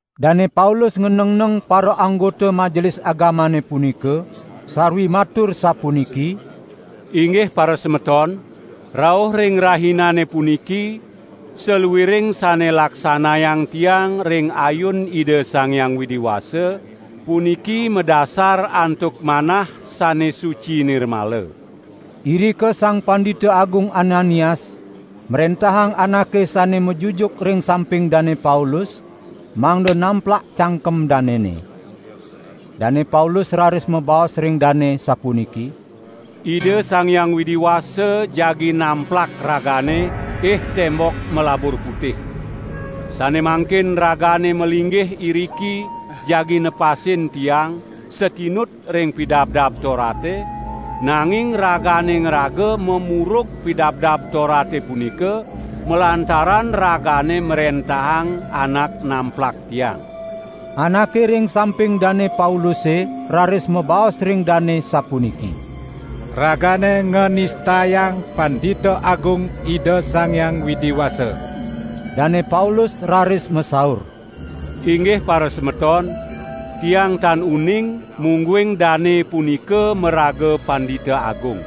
Dane Paulus nganengneng paraanggota Majelis Agamane punika, sarwi matur sapuniki: "Inggih parasemeton! Rauh ring rahinane puniki saluiring sane laksanayang tiang ring ayun Ida Sang Hyang Widi Wasa, puniki madasar antuk manah sane suci nirmala." Irika Sang Pandita Agung Ananias mrentahang anake sane majujuk ring samping Dane Paulus, mangda namplak cangkem danene. Dane Paulus raris mabaos ring dane sapuniki: "Ida Sang Hyang Widi Wasa jagi namplak ragane, ih tembok malabur putih! Sane mangkin ragane malinggih iriki jagi nepasin tiang satinut ring Pidabdab Torate, nanging ragane ngraga mamurug Pidabdab Torate punika, malantaran ragane mrentahang anak namplak tiang!" Anake ring samping Dane Pauluse raris mabaos ring dane sapuniki: "Ragane nganistayang Pandita Agung Ida Sang Hyang Widi Wasa!" Dane Paulus raris masaur: "Inggih parasemeton, tiang tan uning, mungguing dane punika maraga Pandita Agung.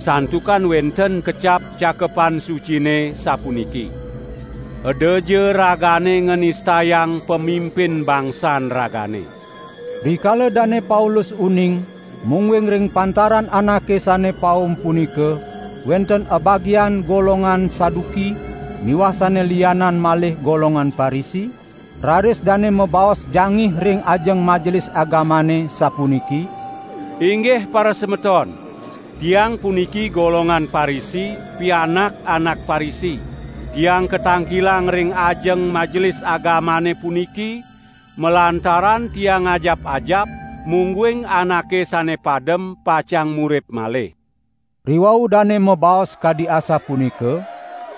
Santukan wenten kecap Cakepan Sucine, sapuniki: 'Edaja ragane nganistayang pamimpin bangsan ragane.' " Rikala Dane Paulus uning mungguing ring pantaran anake sane paum punika wenten abagian golongan Saduki miwah sane lianan malih golongan Parisi, raris dane mabaos jangih ring ajeng Majelis Agamane sapuniki: "Inggih parasemeton! Tiang puniki golongan Parisi, pianak anak Parisi. Tiang katangkilang ring ajeng Majelis Agamane puniki malantaran tiang ngajap-ajap mungguing anake sane padem pacang murip malih!" Riwau Dane mabaos kadi asapunika,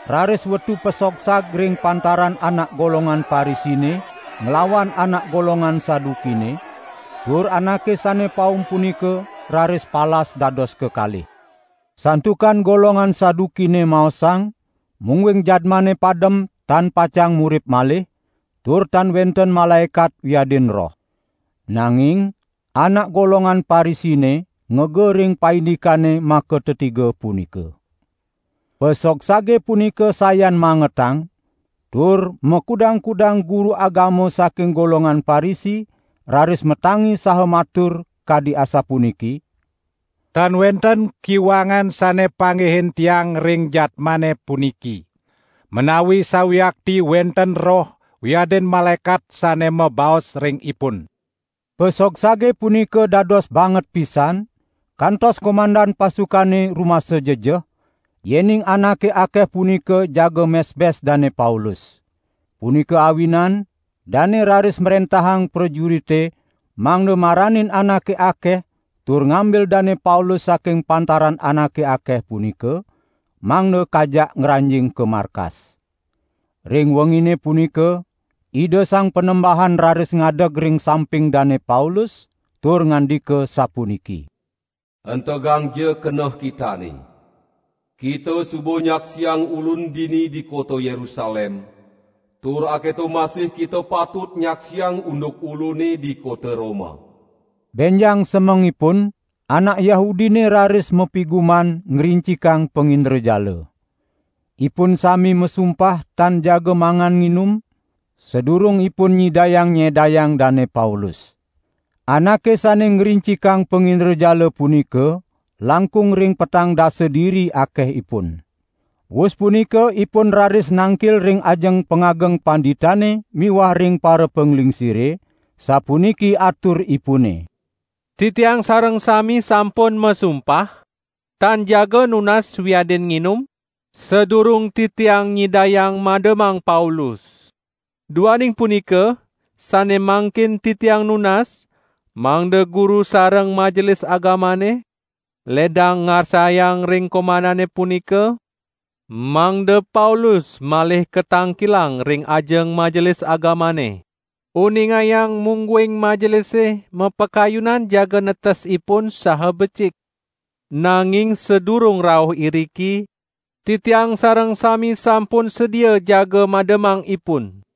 raris wetu pasogsag ring pantaran anak golongan Parisine, nglawan anak golongan Sadukine, tur anake sane paum punika raris palas dados kekalih. ( Santukan golongan Sadukine maosang, mungguing jadmane padem tan pacang murip malih, tur tan wenten malaekat wiadin roh. Nanging anak golongan Parisine ngega ring paindikane makatetiga punika.) Pasogsage punika sayan mangetang, tur makudang-kudang guru agama saking golongan Parisi raris matangi saha matur, kadi asapuniki: "Tan wenten kiwangan sane panggihin tiang ring jadmane puniki. Menawi sawiakti wenten roh wiadin malaekat sane mabaos ring ipun!" Pasogsage punika dados banget pisan, kantos komandan pasukane rumasa jejeh, yening anake akeh punika jaga mesbes Dane Paulus. Punika awinan dane raris mrentahang prajurite mangda maranin anake akeh tur ngambil Dane Paulus saking pantaran anake akeh punika, mangda kajak ngranjing ka markas. Ring wengine punika Ida Sang Panembahan raris ngadeg ring samping Dane Paulus tur ngandika sapuniki: "Entegangja keneh kitane! Kita suba nyaksiang Ulun dini di kota Yerusalem, tur aketo masih kita patut nyaksiang unduk Ulune di kota Roma." Benjang semengipun anak Yahudine raris mapiguman, ngrincikang pangindrajala. Ipun sami masumpah tan jagi mangan nginum, sadurung ipun nyidayang nyedayang Dane Paulus. Anake sane ngrincikang pangindrajala punika langkung ring petang dasa diri akehipun. Wus punika ipun raris nangkil ring ajeng pangageng panditane miwah ring parapanglingsire, sapuniki aturipune: "Titiang sareng sami sampun masumpah, tan jaga nunas wiadin nginum, sadurung titiang nyidayang mademang Paulus. Duaning punika, sane mangkin titiang nunas mangda guru sareng Majelis Agamane ledang ngarsayang ring komandane punika, mangda Paulus malih katangkilang ring ajeng Majelis Agamane. Uningayang mungguing Majelise mapakayunan jaga netes ipun saha becik. Nanging sadurung rauh iriki, titiang sareng sami sampun sedia jaga mademang ipun."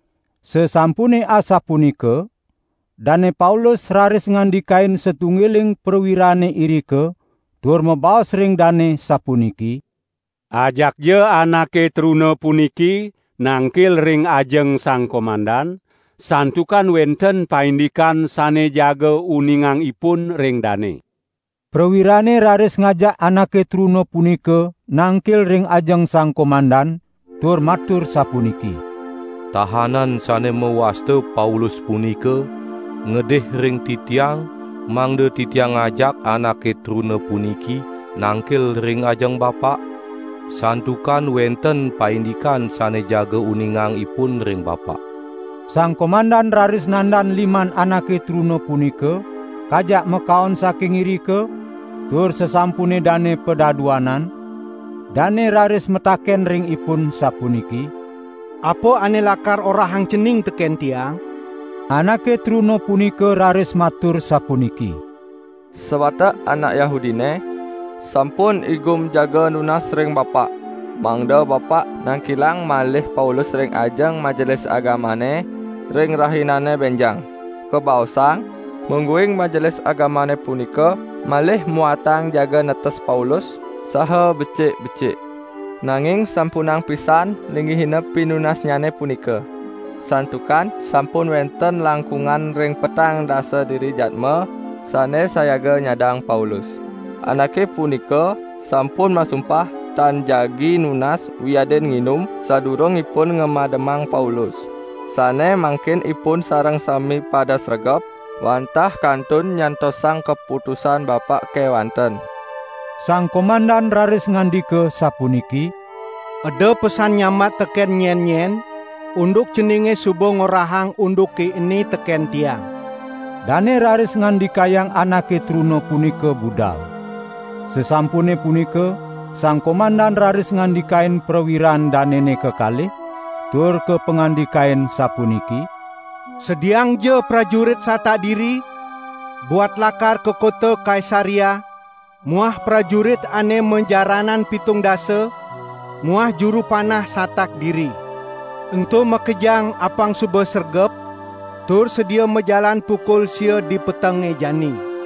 Sasampune asapunika Dane Paulus raris ngandikain satunggiling prawirane irika tur mabaos ring dane sapuniki: "Ajakja anake truna puniki nangkil ring ajeng sang komandan, santukan wenten paindikan sane jaga uningang ipun ring dane." Prawirane raris ngajak anake truna punika nangkil ring ajeng sang komandan, tur matur sapuniki: "Tahanan sane mawasta Paulus punika ngedih ring titiang mangda titiang ngajak anake truna puniki nangkil ring ajeng bapak, santukan wenten paindikan sane jaga uningang ipun ring bapak." Sang komandan raris nandan liman anake truna punika, kajak makaon saking irika, tur sasampune dane padaduanan, dane raris mataken ring ipun sapuniki: "Apa ane lakar orahang cening teken tiang?" Anake truna punika raris matur sapuniki: "Sawatek anak Yahudine sampun igum jaga nunas ring bapak mangda bapak nangkilang malih Paulus ring ajeng Majelis Agamane ring rahinane benjang. Kabaosang, mungguing Majelis Agamane punika malih muatang jaga netes Paulus saha becik-becik. Nanging sampunang pisan linggihina pinunasnyane punika. Santukan sampun wenten langkungan ring petang dasa diri jadma sane sayaga nyadang Paulus. Anake punika sampun masumpah tan jagi nunas wiadin nginum sadurung ipun ngamademang Paulus. Sane mangkin ipun sareng sami pada sregep, wantah kantun nyantosang kaputusan bapak kewanten." Sang komandan raris ngandika sapuniki: "Eda pesan nyambat teken nyen-nyen, unduk ceninge suba ngorahang unduke ene teken tiang." Dane raris ngandikayang anake truna punika budal. Sasampune punika sang komandan raris ngandikain prawiran danene kekalih, tur kapangandikain sapuniki: "Sediaangja prajurit satak diri buat lakar ka kota Kaisarea muah prajurit ane majaranan pitung dasa muah juru panah satak diri. Ento makejang apang suba sregep tur sedia majalan pukul sia di petenge jani.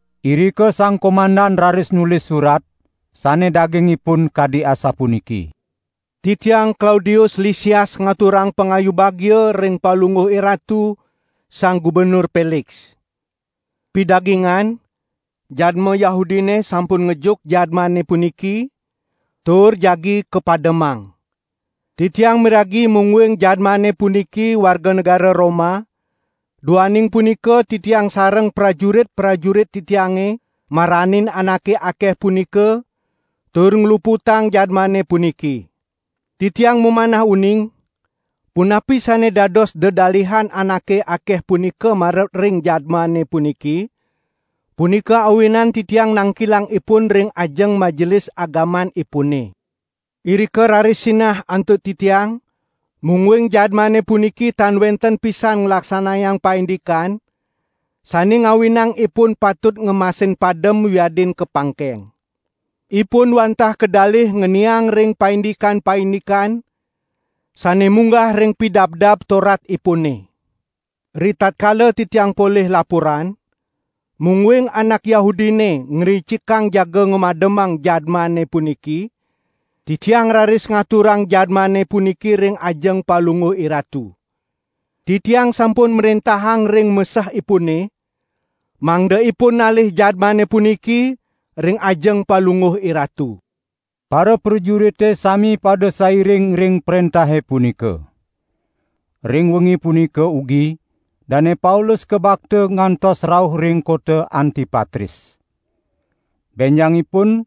Irika sang komandan raris nulis surat, sane dagingipun kadi asapuniki: "Titiang Klaudius Lisias ngaturang pangayu bagia ring palungguh iratu, Sang Gubernur Peliks. Pidagingan, jadma Yahudine sampun ngejuk jadmane puniki, tur jagi kapademang. Titiang miragi mungguing jadmane puniki warga negara Roma, duaning punika titiang sareng prajurit-prajurit titiange maranin anake akeh punika, tur ngluputang jadmane puniki. Titiang mamanah uning, punapi sane dados dedalihan anake akeh punika marep ring jadmane puniki, punika awinan titiang nangkilang ipun ring ajeng Majelis Agamanipune. Irika raris sinah antuk titiang, mungguing jadmane puniki tan wenten pisan nglaksanayang paindikan sane ngawinang ipun patut ngemasin padem wiadin kapangkeng. Ipun wantah kadalih ngeniang ring paindikan-paindikan sane munggah ring Pidabdab Toratipune. Ritatkala titiang polih laporan, mungguing anak Yahudine ngrincikang jaga ngamademang jadmane puniki, titiang raris ngaturang jadmane puniki ring ajeng palungguh iratu. Titiang sampun mrentahang ring mesehipune, mangda ipun nalih jadmane puniki ring ajeng palungguh iratu." Paraprajurite sami pada sairing ring prentahe punika. Ring wengi punika ugi Dane Paulus kabakta ngantos rauh ring kota Antipatris. Benjangipun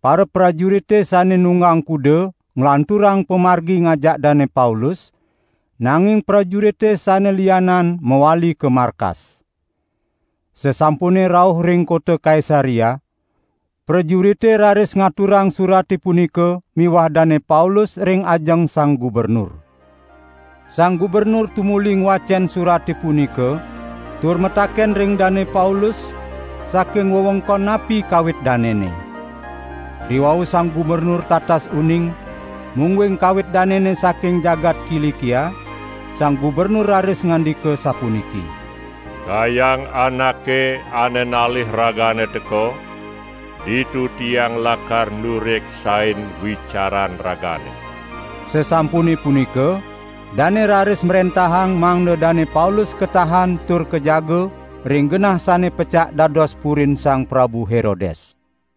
paraprajurite sane nunggang kuda nglanturang pamargi ngajak Dane Paulus, nanging prajurite sane lianan mawali ka markas. Sasampune rauh ring kota Kaisarea, prajurite raris ngaturang surate punika miwah Dane Paulus ring ajeng sang gubernur. Sang gubernur tumuli ngwacen surate punika tur mataken ring Dane Paulus, saking wewengkon napi kawit danene. Riwau sang gubernur tatas uning, mungguing kawit danene saking jagat Kilikia, sang gubernur raris ngandika sapuniki: "Kayang anake ane nalih ragane teka, ditu tiang lakar nureksain wicaran ragane." Sasampune punika dane raris mrentahang mangda Dane Paulus katahan tur kajaga ring genah sane pecak dados purin Sang Prabu Herodes.